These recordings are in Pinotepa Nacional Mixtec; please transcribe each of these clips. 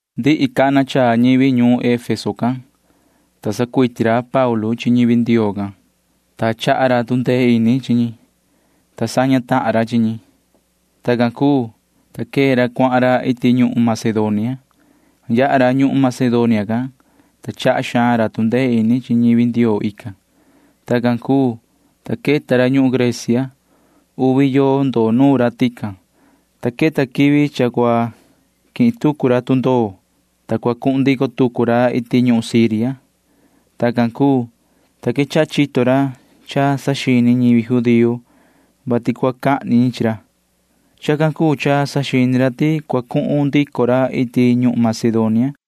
Ndihi cana chaa ñivi ñuun Efeso can, ta sanducuiti ra Paulu chi ñivi Ndioo can, ta chaha ra tu ndee ini chi ñi, ta saña tahan ra chi ñi. Tacan cuu, ta quee ra cuahan ra iti ñuhun Macedonia. Yaha ra ñuhun Macedonia can, ta chaha xaan ra tu ndee ini chi ñivi Ndioo ican. Tacan cuu, ta queta ra ñuhun Grecia. Uvi yoo ndoo nuun ra tican, ta queta quivi cha cua quihin tucu ra tundoo, ta cua cuhun ndico tucu ra iti ñuhun Siria. Tacan cuu, ta quechaha chito ra cha saxini ñivi judío vati cua cahni ñi chi ra. Chacan cuu cha saxini ra ti cua cuhun ndico ra iti ñuhun Macedonia.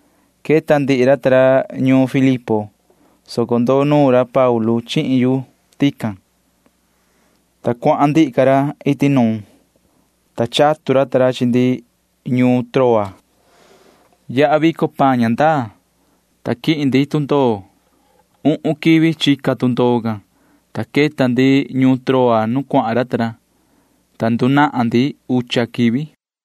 Queta ndihi ra ta ra ñuun Filipo, soco ndoo nuun ra Paulu chihin yu tican, ta cuahan ndihi ca ra iti nuun, ta chatu ra ta ra chi ndi ñuun Troa. Yaha vico paan ña ndaa, ta quihin ndi tundoo. Uhun quivi chica tundoo can, ta queta ndi ñuun Troa nu cuahan ra ta ra, ta ndunahan ndi ucha quivi.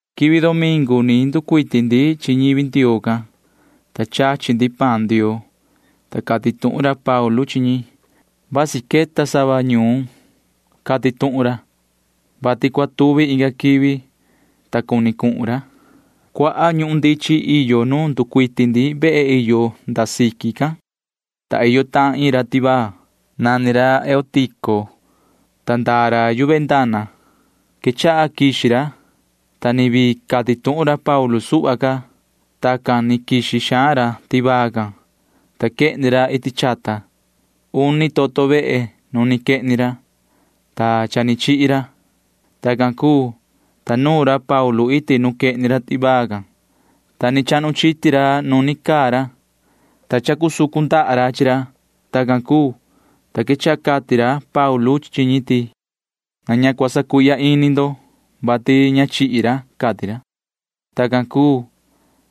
Quivi domingu ni nducuiti ndi chi ñivi Ndioo can, ta chachi ndi paan Ndioo, ta cati tuhun ra Paulu chi ñi. Vasi queta sava ñuun cati tuhun ra, vati cua tuvi inga quivi, ta cuni cuhun ra. Cuaha ñuhun ndichin iyo nu nducuiti ndi vehe iyo nda siqui can, ta iyo tahan iin ra tivaa. Nani ra Eutico, ta ndaa ra yu ventana. Quechaha quixi ra, ta ni vii cati tuhun ra Paulu suhva ca. Tacan ni quixi xaan ra tivaa can, ta quehni ra iti chata. Uni toto vehe nu ni quehni ra, ta cha ni chihi ra. Tacan cuu, ta nuun ra Paulu iti nu quehni ra tivaa can, ta ni chahnu chiti ra nu ni caa ra, ta chacusucu ndaha ra chi ra. Tacan cuu, ta quechaha cati ra Paulu chi ñi ti: ―Na ña cua sacuihya ini ndo, vati ña chihi ra ―cati ra. Tacan cuu,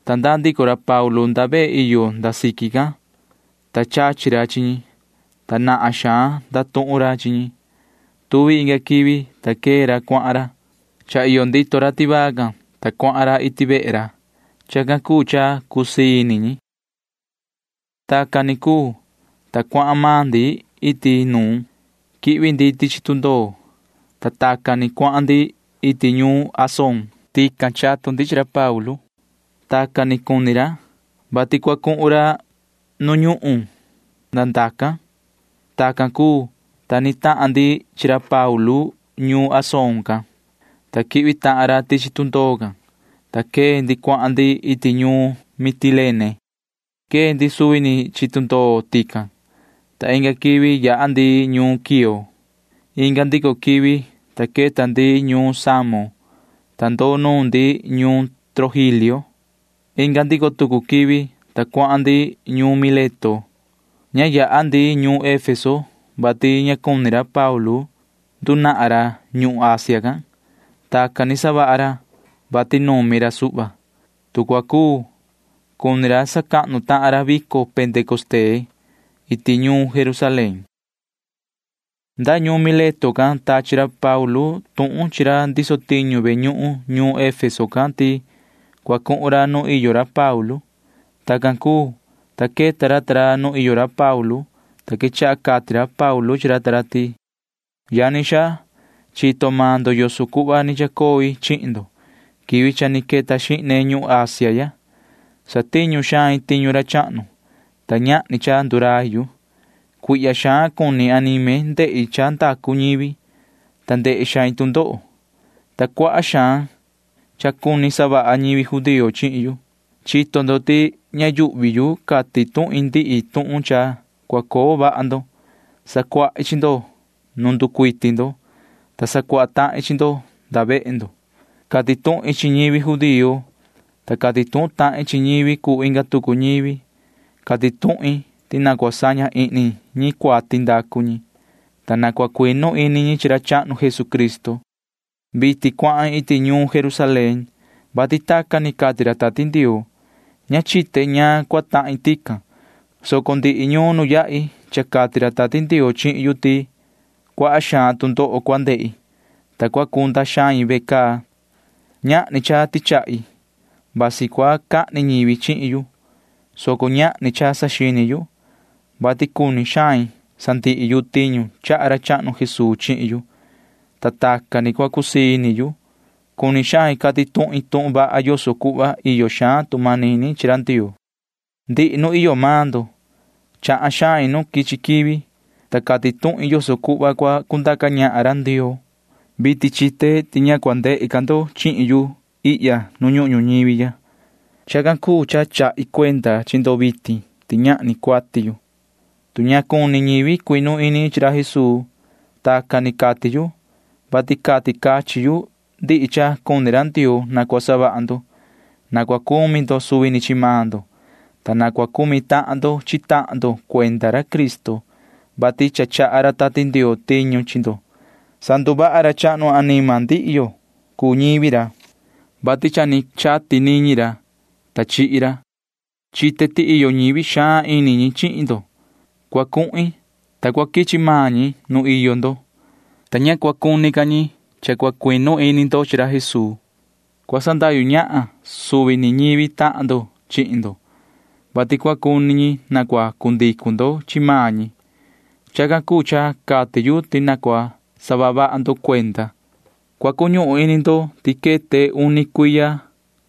ta ndaa ndico ra Paulu nda vehe iyo nda siqui can, ta chachi ra chi ñi, ta nahan xaan ndatuhun ra chi ñi. Tuvi inga quivi, ta quee ra cuahan ra. Cha iyo ndito ra tivaa can, ta cuahan ra iti vehe ra. Chacan cuu cha cusii ini ñi. Tacan ni cuu, ta cuahan maan ndi iti nuun. Quihvi ndi tichi tundoo, ta tacan ni cuahan ndi iti ñuun Asón. Tican chatu ndi chi ra Paulu. Tacan ni cuni ra, vati cua cuhun ra nu ñuhun nda ndacan. Tacan cuu, ta ni tahan ndi chi ra Paulu ñuun Asón can, ta quihvi tahan ra tichi tundoo can, ta quee ndi cuahan ndi iti ñuun Mitilene. Quee ndi suvi ni chi tundoo tican, ta inga quivi yaha ndi ñuun Quío. Inga ndico quivi, ta queta ndi ñuun Samo, ta ndoo nuun ndi ñuun Trogilio. Inga ndico tucu quivi, ta cuahan ndi ñuun Mileto. Ña yaha ndi ñuun Efeso, vati ña cuni ra Paulu ndunahan ra ñuhun Asia can. Tacan ni savaha ra, vati numi ra suhva. Tu cua cuu, cuni ra sacahnu tahan ra vico Pentecostee iti ñuun Jerusalén. Nda ñuun Mileto can tachi ra Paulu tuhun chi ra ndiso tiñu ve ñuhun ñuun Efeso can ti cua cuhun ra nu iyo ra Paulu. Tacan cuu, ta queta ra ta ra nu iyo ra Paulu, ta quechaha cati ra Paulu chi ra ta ra ti: ―Yani xaa, chito maan ndo yoso cuhva ni chacoi chihin ndo quivi cha ni queta xihne ñuhun Asia ya. Satiñu xain tiñu ra chahnu, ta ñahni cha ndurai yu. Cuihya xaan cuni anime ndehi cha ndacu ñivi, ta ndehe xain tu ndoho, ta cuaha xaan cha cuni savaha ñivi judío chihin yu. Chito ndo ti ña yuhvi yu cati tuhin ndihi tuhun cha cua coo vaha ndo. Sacuahi chi ndo nuun nducuiti ndo, ta sacuaha tahin chi ndo nda vehe ndo. Cati tuhin chi ñivi judío, ta cati tuhun tahin chi ñivi cuu inga tucu ñivi. Cati tuhin ti na cua saña ihni ñi cuati ndacu ñi, ta na cua cuinu ini ñi chi ra chahnu Jesucristo. Vitin cuahin iti ñuun Jerusalén, vati tacan ni cati ra Tati Ndioo. Ña chite ñaan cua tahin tican, soco ndihi ñuun nu yahi cha cati ra Tati Ndioo chihin yu ti cuaha xaan tu ndoho cua ndehi, ta cua cunda xain ve caa. Ñahni cha tichahi. Vasi cua cahni ñivi chihin yu, soco ñahni cha saxini yu, vati cuni xain sandihi yu tiñu chaha ra chahnu Jesuu chihin yu, ta tacan ni cua cusii ini yu. Cuni xain cati tuhin tuhun vaha yoso cuhva iyo xaan tu manini chi ra Ndioo. ’Ndihi nu iyo maan ndo chahan xain nu quichi quivi, ta cati tuhin yoso cuhva cua cundaca ñahan ra Ndioo. Vitin chite ti ña cua ndehe ca ndo chihin yu ihya nu ñuhun ñuñivi ya. Chacan cuu cha chahi cuenda chi ndo vitin ti ñahni cuati yu, tu ña cuni ñivi cuinu ini ñi chi ra Jesuu. Tacan ni cati yu, vati cati cachin yu ndihi cha cuni ra Ndioo na cua savaha ndo. Na cua cumi ndo suvi ni chi maan ndo, ta na cua cumi tahan ndo chi tahan ndo cuenda ra Cristo, vati cha chaha ra Tati Ndioo tiñu chi ndo. Sanduvaha ra chahnu anima ndihi yo cuu ñivi ra, vati cha ni chati niñi ra, ta chihi ra. Chite ti iyo ñivi xaan ini chihin ndo. Cua cuhin, ta cua quichi maan ñi nu iyo ndo, ta ña cua cuni ca ñi cha chinu ini ndo chi ra Jesuu. Cua sandahyu ñahan suvi ni ñivi tahan ndo chihin ndo, vati cua cu cuni ñi na cua cu ndicu ndo chi maan ñi. Chacan cuu cha cati yu ti na cua saha vaha ndo cuenda. Cua cuñuhun ini ndo ti queta uni cuiya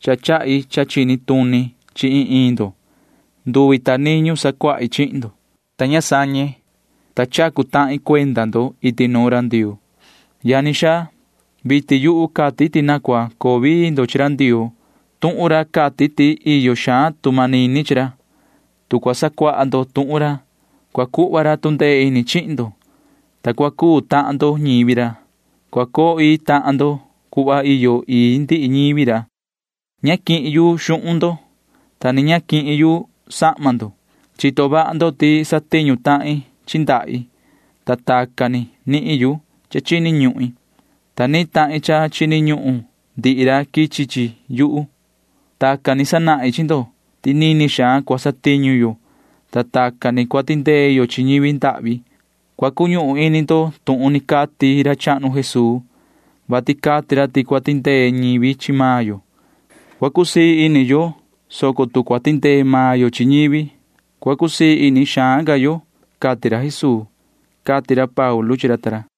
cha chahi cha chini tuni chi iin iin ndo. Nduvi ta niñu sacuahi chihin ndo, ta ña sañe, ta chacu tahin cuenda ndo iti nuun ra Ndioo. ’Yani xaa, vitin yuhu cati ti na cua coo vii ndo chi ra Ndioo. Tuhun ra cati ti iyo xaan tu manini chi ra. Tu cua sacuaha ndo tuhun ra, cua cuhva ra tu ndee ini chihin ndo, ta cua cuu tahan ndo ñivi ra. Cua coo ii tahan ndo cuhva iyo ii ndihi ñivi ra. Ña quihin yu xuhun ndo, ta ni ña quihin yu sahma ndo. Chito vaha ndo ti satiñu tahin chi ndahi, ta tacan ni nihin yu cha chini ñuhin, ta nihin tahin cha chini ñuhun ndihi ra quichi chi yuhu. Tacan ni sanahin chi ndo ti nini xaan cua satiñu yo, ta tacan ni cua tindee yo chi ñivi ndahvi. Cua cuñuhun ini ndo tuhun ni cati ra chahnu Jesuu, vati cati ra ti tu cua tindee ñivi chi maan yo, cua cusii ini yo, soco tu cua tindee maan yo chi ñivi, cua cusii ini xaan ca yo, cati ra Jesuu ―cati ra Paulu chi ra ta ra.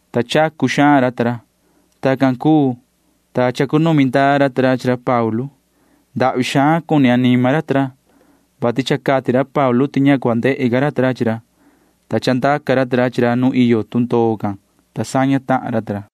ta chacu xaan ra ta ra. Tacan cuu, ta chacunumi ndaa ra ta ra chi ra Paulu. Ndahvi xaan cuni anima ra ta ra, vati cha cati ra Paulu ti ña cua ndehe ca ra ta ra chi ra, ta chandaca ra ta ra chi ra nu iyo tundoo can, ta saña tahan ra ta ra.